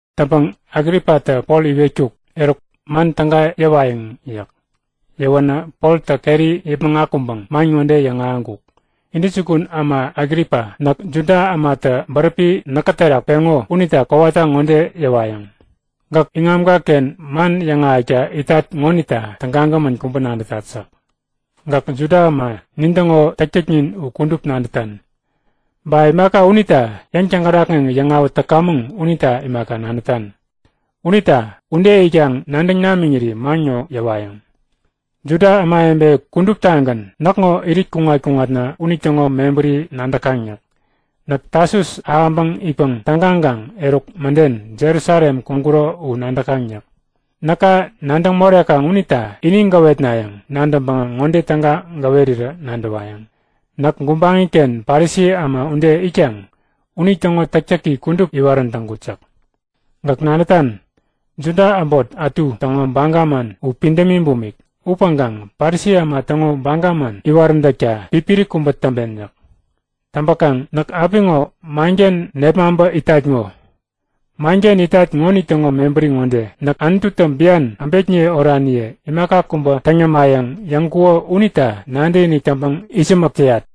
Täŋpäŋ Agripatä Pol iwetkuk; Eruk, man täga yäwayäŋ yäk. Yäwänä Poltä keri yäpmäŋ akuŋpäŋ man ŋode yäŋahäŋkuk; Intäjukun äma Agripa, näk Juda ämatä bäräpi näkä terak peŋo unita kowata ŋode yäwayäŋ; Gäk iŋamka-ken man yäŋahäkta itat ŋonita tägagämän kubä nadätat yäk. Gäk Juda äma nintäŋo täktäknin u kudup nadätan. Ba imaka unita yäŋ-täŋkärakŋeŋ yäŋawät täkamäŋ unita imaka nadätan. Unita ude itkaŋ nadäŋ namiŋiri man ŋo yäwayäŋ. Juda ämawebe kuduptagän näkŋo irit kuŋat-kuŋat unitäŋo mebäri nadäkaŋ yäk. Näk Tasus ahäŋpäŋ itpäŋ tägaŋkaŋ eruk mäden Jerusalem kuŋkuro u nadäkaŋ yäk. Näka nadäŋ morekaŋ unita ini gäwetnayäŋ nadäŋpäŋä ŋode täga gäwerirä nadäwayäŋ; Näk gubaŋi-ken Parisi äma ude itkaŋ unitäŋo täktäki kudup iwarän täŋkut yäk. Gäk nadätan, Juda äbot ätu täŋo baga man u pidämi bumik upäŋkaŋ Parisi äma täŋo baga man iwaräntäkta pipiri kubä täŋpen yäk. Täŋpäkaŋ näk apiŋo manken nepmaŋpä itat ŋo. Manken itat ŋonitäŋo mebäri ŋode; Näk Anututä bian äbekniye oraniye imaka kubä täŋ yämayäŋ yäŋkuko unita nadäkinik täŋpäŋ itsämäk täyat.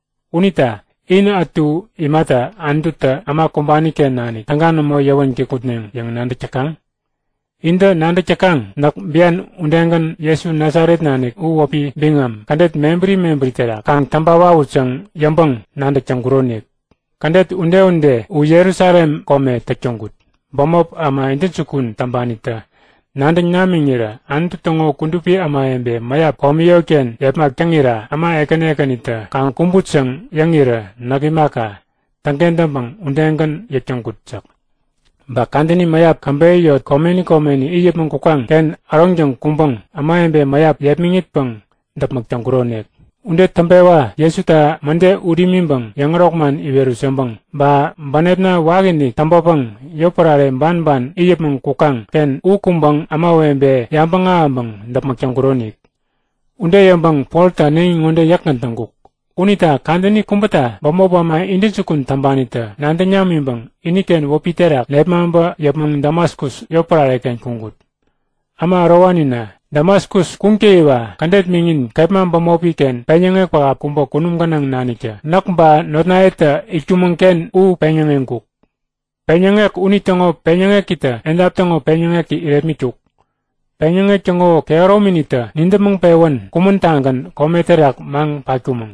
Unita in ätu imata Anututä äma kumbani-ken nanik täga nämo yäwän kikŋutneŋ yäŋ nadäk täkaŋ? Intä nadäk täkaŋ, näk bian udegän Jesu Nasaret nanik u wäpi biŋam kädet mebäri mebäri terak kaŋ täŋpa wawut yäŋ yäŋpäŋ-nadäk täŋkuronik. Kädet ude-ude u Jerusalem kome täk täŋkut. Bämop äma intäjukun täŋpanitä nadäŋ namiŋirä Anutu täŋo kudupi ämawebe mäyap komi yotken yepmak täŋira äma ekäni ekänitä kaŋ kumbut yäŋ yäŋirä näk imaka, täŋkentäŋpäŋ udegän yäk täŋkut yäk. Ba kadäni mäyap käbeyä yot komeni komeni it yäpmäŋ kukaŋ-ken äroŋtäŋ kuŋpäŋ ämawebe mäyap yepmäŋitpäŋ däpmäk täŋkuronik. Ude täŋpewa Jesuta mäde ut imiŋpäŋ yäŋärok man iwerut yäŋpäŋ, ba bänepna wakiinik täŋpäpäŋ yotpärare banban it yäpmäŋ kukaŋ-ken u kuŋpäŋ ämawebe yabäŋ ahäŋpäŋ däpmäk täŋkuronik. Ude yäŋpäŋ Poltä äneŋi ŋode yäkgän täŋkuk; Unita kadäni kubäta bämop äma intäjukun täŋpanitä nadäŋ namiŋpäŋ iniken wäpi terak nepmaŋpä yäpmäŋ Damaskus yotpärare-ken kuŋkut. Äma ärowanina, Damaskus kuŋtäyiwa kädet miŋin kepma bämopi-ken peŋyäŋek pähap kubä kunum gänaŋ naniktä näk ba notnayetä itkumäŋ-ken u peŋyäŋeŋkuk. Peŋyäŋek unitäŋo peŋyäŋekitä edap täŋo peŋyäŋeki irepmitkuk. Peŋyäŋek täŋo kehärominitä nidäpmäŋ-pewän kumän-tagän kome terak maŋ patkumäŋ.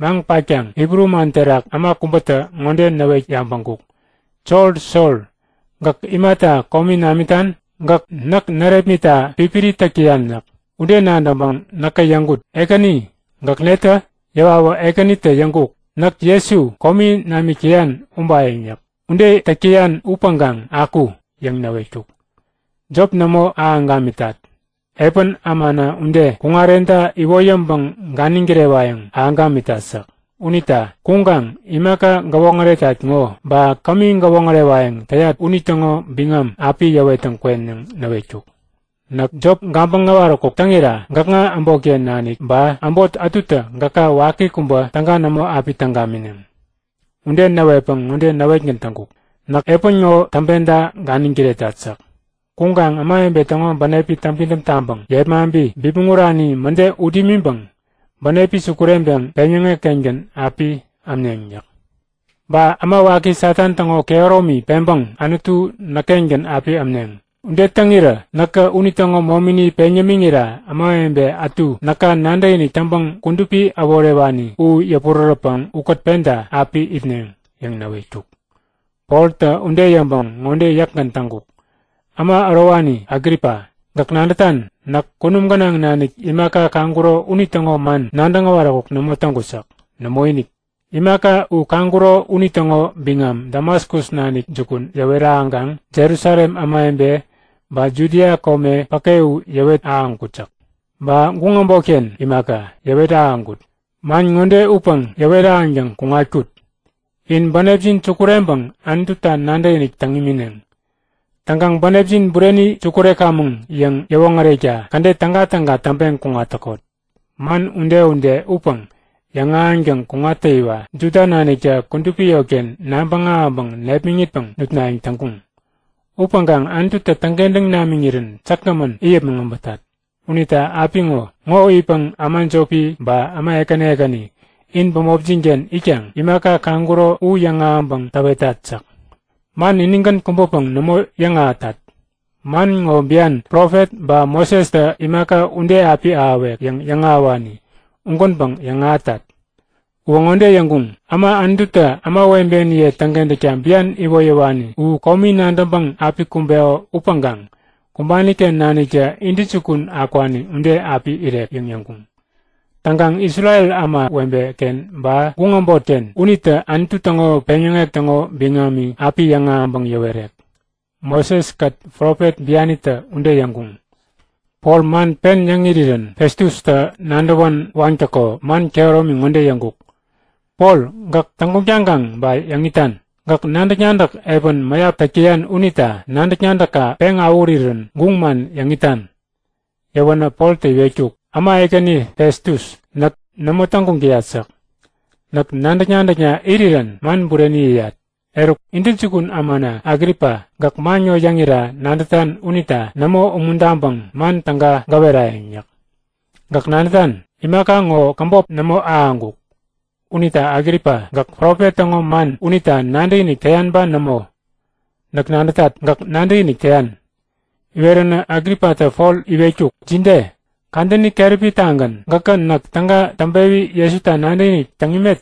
Maŋ patkaŋ Hibru man terak äma kubätä ŋode näwet yabäŋkuk; Sol, Sol, gäk imata komi namitan? Gäk näk närepmitta pipiri täk täyan yäk. Ude nadäŋpäŋ näkä yäŋkut; Ekäni, gäk netä? Yäwawä Ekänitä yäŋkuk; Näk Jesu, komi namik täyan ubayäŋ yäk. Ude täk täyan upäŋkaŋ aku! yäŋ näwetkuk. Jop nämo ahäŋ gamitat. Epän ämana ude kuŋarenta iwoyäŋpäŋ ganiŋ kirewayäŋ ahäŋ gamitat yäk. Unita kuŋkaŋ imaka gäwoŋäretat ŋo, ba kämi gäwoŋärewayäŋ täyat unitäŋo biŋam api yäwettäŋ kwen yäŋ näwetkuk. Näk jop gabäŋ äwaräkuk täŋira gäkŋa äbotken nanik ba äbot ätutä gäka waki kubä täga nämo api täŋ gamineŋ. Ude näwetpäŋ ŋode näwetgän täŋkuk; Näk epän ŋode täŋpenta ganiŋ kiretat yäk. Kuŋkaŋ ämawebe täŋo bänepi täŋpidäm taŋpäŋ yepmaŋpi bipmäŋ urani mäde ut imiŋpäŋ bänepi sukureŋpeŋ peŋyäŋek-kengän api ämneŋ yäk. Ba äma waki Satan täŋo kehäromi peŋpäŋ Anutu näk-kengän api ämneŋ. Ude täŋirä näkä unitäŋo momini peŋ yämiŋira ämawebe ätu näka nadäkinik täŋpäŋ kudupi äworewani u yäpurärätpäŋ ukät penta api itneŋ yäŋ näwetkuk. Poltä ude yäŋpäŋ ŋode yäkgän täŋkuk; Äma ärowani Agripa, gäk nadätan? Näk kunum gänaŋ nanik imaka kaŋkuro unitäŋo man nadäŋ äwaräkuk nämo täŋkut yäk. Nämoinik! Imaka u kaŋkuro unitäŋo biŋam Damaskus nanik jukun yäwet ahäŋkaŋ Jerusalem ämawebe ba Judia kome päke u yäwet ahäŋkut yäk. Ba guŋ äbotken imaka, yäwet ahäŋkut. Man ŋode upäŋ yäwet ahäŋtäŋ kuŋatkut; In bänepjin sukureŋpäŋ Anututa nadäkinik täŋ imineŋ. Täŋkaŋ bänepjin bureni sukurekamäŋ yäŋ yäwoŋärekta kädet tägatäga täŋpeŋ kuŋat täkot. Man ude-ude upäŋ yäŋahäŋtäŋ kuŋattäyiwa Juda naniktä kudupi yotken nabäŋ ahäŋpäŋ nepmäŋitpäŋ nutnayäŋ täŋkuŋ. Upäŋkaŋ Anututä täŋkentäŋ namiŋirän säkgämän it yäpmäŋ äbätat. Unita apiŋo ŋo itpäŋ äma jopi ba äma ekäni ekäni in bämopjin-ken itkaŋ imaka kaŋkuro u yäŋahäŋpäŋ täwetat yäk. Man inigän kubäpäŋ nämo yäŋahätat. Man ŋo bian, profet ba Mosestä imaka ude api ahäwek yäŋ yäŋahäwani ugänpäŋ yäŋahätat. Uwä ŋode yäŋkuŋ; Äma Anututä ämawebeniye täŋkentäkta bian iwoyäwani u komi nadäŋpäŋ api kumbeko upäŋkaŋ kumbani-ken naniktä intäjukun akwani ude api irek yäŋ yäŋkuŋ. Täŋkaŋ Isrel ämawebe-ken ba guŋ äbotken unitä Anutu täŋo peŋyäŋek täŋo biŋami api yäŋahäŋpäŋ yäwerek. Moseskät profet bianitä ude yäŋkuŋ. Pol man pen yäŋ irirän Festustä nadäwän waŋtäko man kehäromi ŋode yäŋkuk; Pol gäk täŋguŋ taŋkaŋ ba yäŋ itan? Gäk nadäk-nadäk epän mäyap täk täyan unita nadäk-nadäkka peŋ awähurirän guŋ man yäŋ itan! Yäwänä Poltä iwetkuk; Äma ekäni Festus, näk nämo täŋguŋ täyat yäk. Näk nadäk-nadäkna irirän man bureni yäyat. Eruk, intäjukun ämana Agripa! Gäk man ŋo yäŋira nadätan unita nämo umuntaŋpäŋ man täga gäwerayäŋ yäk. Gäk nadätan, imaka ŋo käbop nämo ahäŋkuk. Unita Agripa, gäk profet täŋo man unita nadäkinik täyan ba nämo? Näk nadätat, gäk nadäkinik täyan. Iweränä Agripatä Pol iwetkuk; Jide? Kadäni keräpi-tagän gäkä näk täga täŋpewi Jesuta nadäkinik täŋ imet?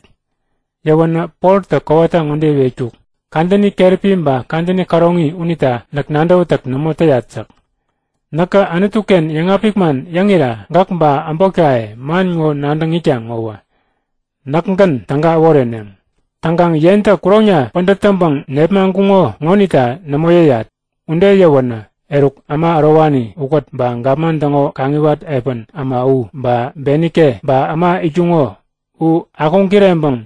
Yäwänä Poltä kowata ŋode iwetkuk; Kadäni keräpi ba kadäni käroŋi unita näk nadäwätäk nämo täyat yäk. Näkä Anutu-ken yäŋapik man yäŋira gäk ba äbotkaye man ŋo nadäŋ itkaŋ ŋowä näkgän täga äworeneŋ. Täŋkaŋ yentä kuroŋna pädät täŋpäŋ nepmaŋkuŋo ŋonita nämo yäyat! Ude yäwänä eruk äma ärowani ukät ba gapman täŋo kaŋiwat epän äma u ba Benike ba äma itkuŋo u akuŋ-kireŋkuŋ.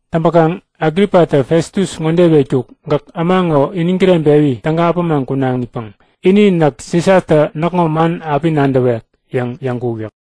Täŋpäkaŋ Agripatä Festus ŋode iwetkuk; Gäk äma ŋo iniŋ kireŋpewi täga äpämaŋ kunaŋipäŋ ini Näk Sisatä näkŋo man api nadäwek yäŋ yäŋkuk yäk.